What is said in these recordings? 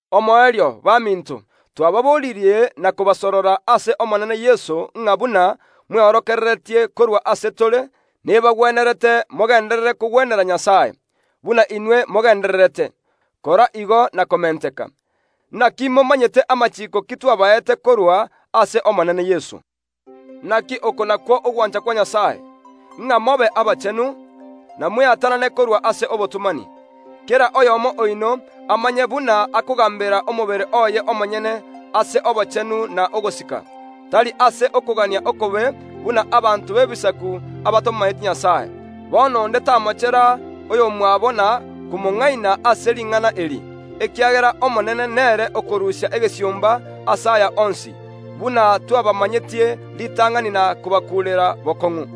Omoerio, baminto, twababoririe na kobasorora ase Omonene Yeso ng’a buna mweorokereretie korwa ase tore nebagwenerete mogenderere kogwenera Nyasae. Buna inwe mogendererete, kora igo na komenteka. Naki momanyete amachiiko ki twabaete korwa ase Omonene Yeso. Naki oko nakwo ogwancha kwa Nyasae, ng’a mobe abachenu, na mweatanane korwa ase obotomani. Kera oyomo oino amanye buna akogambera omobere oye omonyene ase obochenu na ogosika, tari ase okogania okobe buna abanto b’Ebisaku abatamomanyeti Nyasae. Bono onde tamochera oyomwabo na komong’aina ase ring’ana eri, ekiagera Omonene nere okorusia egesiomba ase aya onsi, buna twabamanyetie ritang’ani na kobakuurera bokong’u.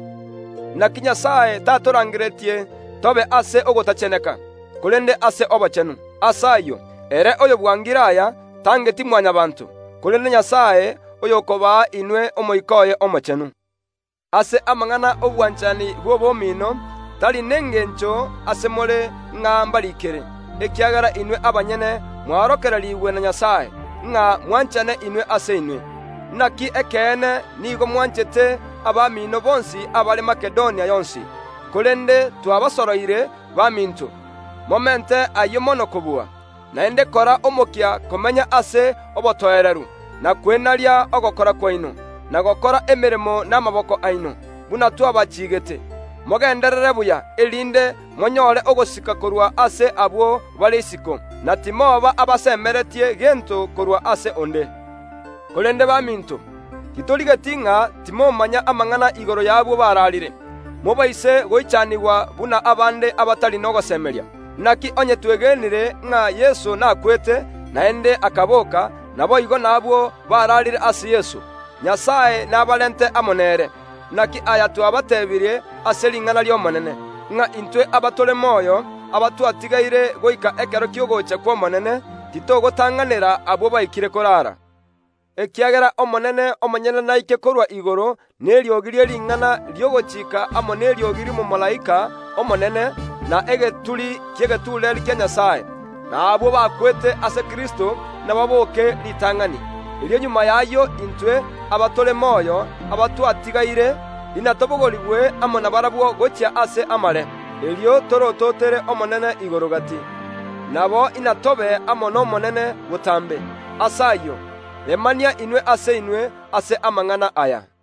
Naki Nyasae tatorangereti tobe ase ogotacheneka, korende ase obochenu. Ase ayio, ere oyobwangire aya, tangeti Mwanyabaanto, korende Nyasae, oyokobaa inwe Omoika oye Omochenu. Ase amang’ana y’obwanchani bw’obomino, tari nengencho ase more ng’a mbariikere, ekiagera inwe abanyene mworokererigwe na Nyasae, ng’a mwanchane inwe ase inwe. Naki ekeene, nigo mwanchete abamino bonsi abare Makedonia yonsi. Korende twabasoroire, baminto, momente ayio mono kobua. Naende kora omokia komenya ase obotoereru, na kwenaria ogokora kwaino, na gokora emeremo namaboko aino, buna twabachiigete. Mogenderere buya, erinde monyore ogosika korwa ase abwo bare isiko, na timoba abamosemeretie gento korwa ase onde. Korende baminto, titorigeti ng’a timomanya amang’ana igoro y’abwo bararire, mobaise goichanigwa buna abande abatari nogosemeria. Naki onye twegenire ng’a Yeso nakwete, naende akaboka, naboigo nabwo bararire ase Yeso, Nyasae nabarente amo nere. Naki aya twabatebirie ase ring’ana ri’Omonene, ng’a intwe abatore moyo, abatwatigaire goika ekero ki’ogocha kw’Omonene, titogotang’anera abwo baikire korara, ekiagera Omonene omonyene naike korwa igoro neriogi rie ring’ana ri’ogochika amo neriogi ri’omomalaika omonene, na egeturi ki’egetureeri kia Nyasae. Na abwo bakwete ase Kristo nababooke ritang’ani. Erio magega y’ayio intwe, abatore moyo, abatwatigaire, inatobogorigwe amo nabarabwo gochia ase amare, erio torototere Omonene igoro gati. Nabo inatobe amo n’Omonene botambe. Ase ayio, remania inwe ase inwe ase amang’ana aya.